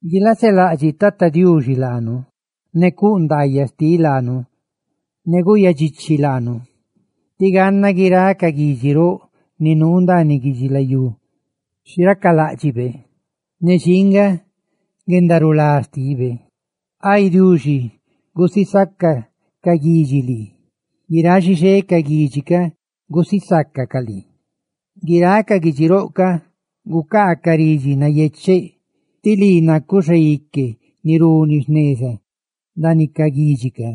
Guilaselaꞌdxiꞌ Tata Diuxi laanu ne cuꞌ ndaayaꞌ laanu, ne guꞌyadxichi laanu. Tí ganna guiráꞌ ca guidxi roꞌ ni nuu ndaaniꞌ guidxilayú xi racaláꞌdxibe ne xinga guendarulá xtibe. Ay Diuxi, gusisaca ca guidxi lii; ¡guiráꞌ xixé ca guidxi gusisácacaꞌ lii! Guiráꞌ ca guidxi roꞌ gucaacaꞌ ridxi nayecheꞌ, tí lii nacuꞌ xaique ni runi jneza ndaaniꞌ ca guidxi ca;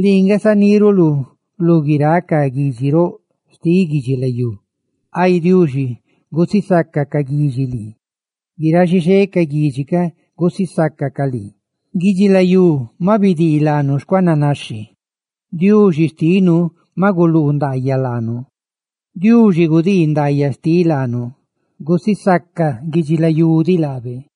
¡lii nga zaniruluꞌ lú guiráꞌ ca guidxi roꞌ xtiꞌ guidxilayú! Ay Diuxi, gusisaca ca guidxi lii; ¡guiráꞌ xixé ca guidxi gusisácacaꞌ lii! Guidxilayú maꞌ bidii laanu xcuananaxhi; ¡Diuxi xtinu maꞌ guluu ndaayaꞌ laanu! ¡Diuxi cuꞌ ndaayaꞌ laanu! ¡Guidubi naca guidxilayú diꞌ gusisaca laabe!